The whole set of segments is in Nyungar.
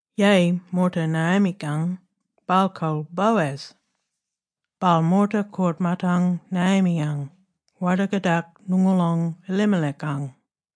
Yeyi, moorta Naomi-kang, baal kol Boaz. Baal moorta koort-maatang Naomi-yang, warda-kadak ngoongoolong Elimelech-ang.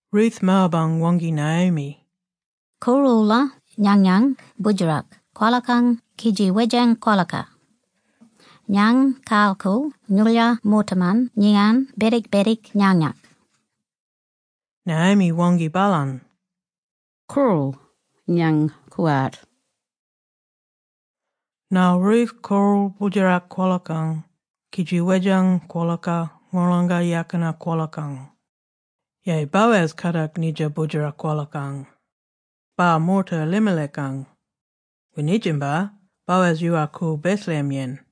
Ruth Moab-ang waangki Naomi, “Koorl-oola nganyany boodjerak kwolakang kidji wedjang kwolaka. Ngany kayar-koorl ngoolyar moortaman ngiyan bedik-bedik nganyak”. Naomi waangki baalany, “Koorl, ngany koowart”. Ngarl Ruth koorl boodjerak kwolakang kidji wedjang kwolaka ngolonga yakina kwolakang. Yeyi, Boaz kadak nidja boodjera kwolakang. Baal moorta Elimelech-ang. Winidjinbar Boaz yoowal-koorl Bethlehem-yen.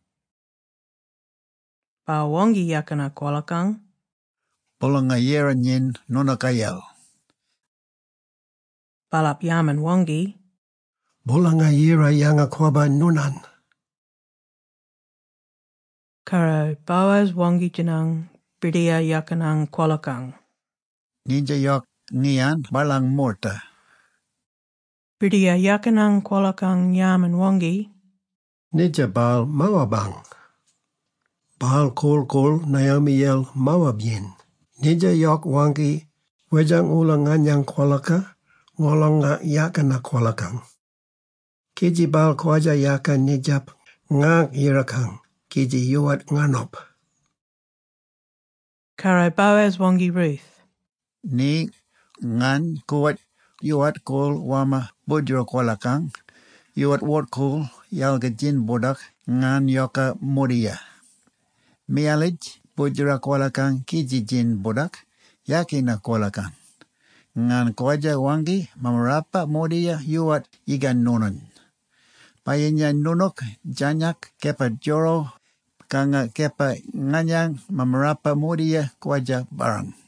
Baal waangki yakina kwolakang, “Boolanga-Yira nyin noonookayel!” Baalap yarman-waangki, “Boolanga-Yira yanga-kwabba noonany!” Karro Boaz waangki-djinang birdiyar yakinang kwolakang, “Nidja yok, ngiyan baalang moorta?” Birdiyar yakinang kwolakang yarman-waangki, “Nidja baal Moabang. Baal korl-koorl Naomi-yel Moab-yen. Nidja yok waangki, ‘Wedjang-oola nganyany kwolaka ngolonga yakina kwolakang’, kidji baal kwadja-yaka nidjap ngaangk yirakang kidji yoowart nganop.” Karro Boaz waangki Ruth, “Ni, ngany koowart, yoowart koorl warmma boodjera kwolakang, yoowart wort-kool yalga djin-bordak ngany yoka mordiya. Miyalitj boodjera kwolakang kidji djin-bordak yakina kwolakang. Ngany kwadja waangki mammarapa mordiya yoowart yigan noonany. Bayinya noonook djarnyak kepa djoro, kanga kepa nganyang mammarapa mordiya kwadja barrang.”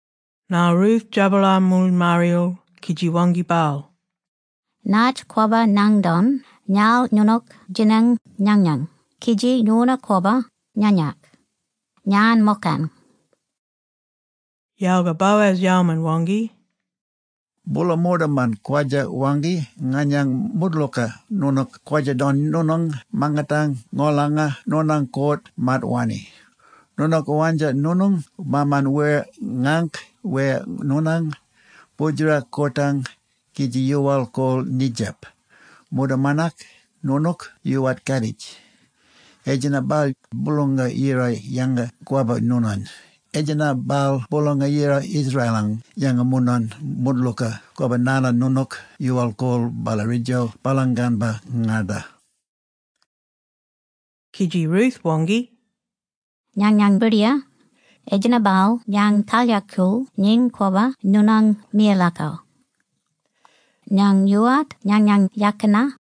Ngarl Ruth djabalar moolymarriyal kidji waangki baal, “Natj kwabba ngany don ngarl noonook djinang nganyany kidji ngorna-kwabba nganyak? Ngany mokang.” Yalga Boaz yalman-waangki, “Boola moortaman kwadja-waangki nganyany moodlooka noonook kwadja-don noonang mangatang ngolanga noonang koort-maat wanni. Noonook wandja noonang maaman wer ngaangk wer noonang boodjera koortang, kidji yoowal-koorl nidjap, moortamanak noonook yoowart katitj. Etjenna-bal Boolanga-Yira yanga-kwabba noonany. Etjenna-bal Boolanga-Yira Israel-ang yanga noonany moodlooka kwabba narla noonook yoowal-koorl ballaridjo baalang ganbar-ngarda.” Kidji Ruth waangki, “Nganyang birdiyar, etjenna-bal ngany kalyakool nyin kwabba noonang miyalakal. Ngany yoowart nganyang yakina,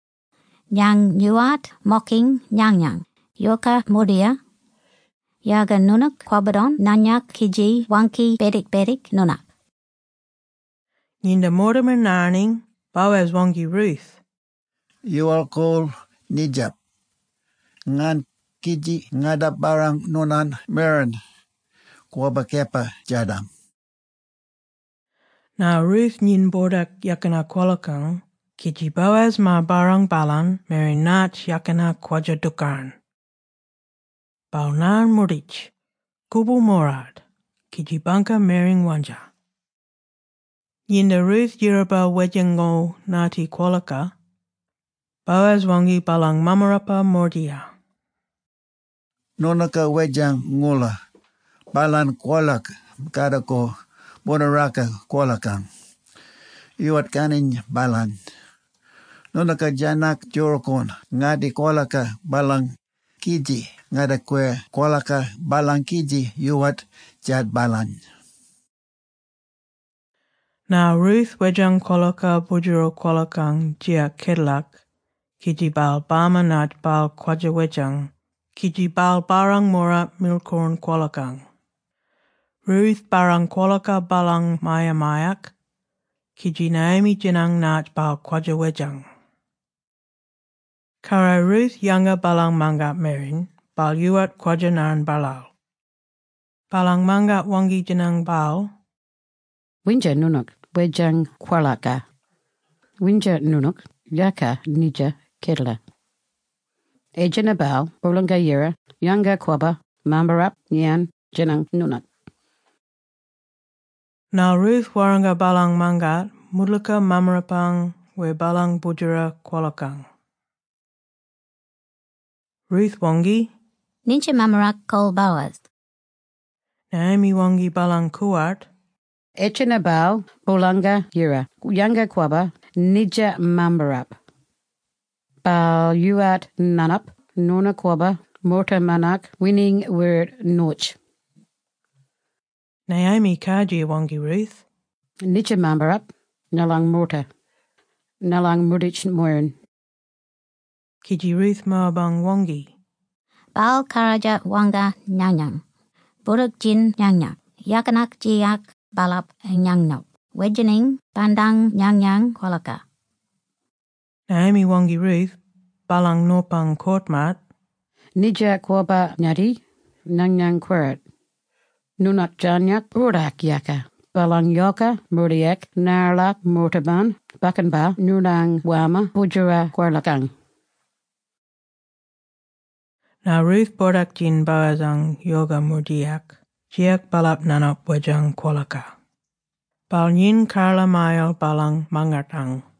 ngany yoowart mokiny nganyang yoka mordiya, yalga noonook kwabba-don nganyak kidji waangki bedik-bedik noonak.” Nginda moortaman ngarniny, Boaz waangki Ruth, “Yoowal-koorl nidjap. Ngarn, kidji ngarda-barrang noonang mwereny bwora kepa djadam.” Ngarl Ruth nyin bordak yakina kwolakang kidji Boaz maar-barrang baalany mwereny natj yakina kwadja-dookarn. Baal ngarn moorditj, koboorl moorart, kidji bangka mwereny wandja. Nginda Ruth yiraba wedjango ngatti kwolaka, Boaz waangki baalang mammarapa mordiya, “Noonooka wedjang-oola baalany kwolaka kardagor boonaraka kwolakang. Yoowart karnyiny baalany. Noonooka djarnyak djookorn ngatti kwolaka baalang, kidji ngardakwir kwolaka baalang kidji yoowart djaat baalany.” Ngarl Ruth wedjang kwolaka boodjeral kwolakang djiyak kedalak, kidji baal bama natj baal kwadja-wedjang kidji baal barrang moorart mirkloorn kwolakang. Ruth barrang kwolaka baalang mya-myak kidji Naomi djinang natj baal kwadja wedjang. Karro Ruth yanga baalang mangat mwereni baal yoowart kwadja-ngarn baalaal. Baalang mangat waangki-djinang baal, “Windja noonook wedjang kwolaka? Windja noonook yaka nidja kedala? Etjenna-bal Boolanga-Yira yanga-kwabba mammarap ngiyan djinang noonany.” Ngarl Ruth warranga baalang mangat moodlooka mammarapang wer baalang boodjera kwolakang. Ruth waangki, “Nitja mammarap kol Boaz!” Naomi waangki baalang koowart, “Etjenna-bal Boolanga-Yira yanga-kwabba nidja mammarap. Baal yoowart nganop ngorna-kwabba moortamanak wininy wer noyitj.” Naomi kardjir waangki Ruth, “Nidja mammarap ngalang moorta, ngalang moorditj-moyiran.” Kidji Ruth Moabang waangki, “Baal kardjir warranga nganyany, ‘Boordak-djin nganyang yakinak djiyak baalap nganop wedjanginy bandang nganyang kwolaka’.” Naomi waangki Ruth, baalang nopang koort-maat, “Nidja kwabba-ngatti, nganyang koowart. Noonook djarnyak boordak-yaka baalang yoka mordiyak narla moortaman bakkan-pa noonany warmma boodjera kwolakang.” Ngarl Ruth boordak-djin Boaz-ang yoka mordiyak djiyak baalap nganop wedjang kwolaka. Baal nyin karla-mayal baalang mangatang.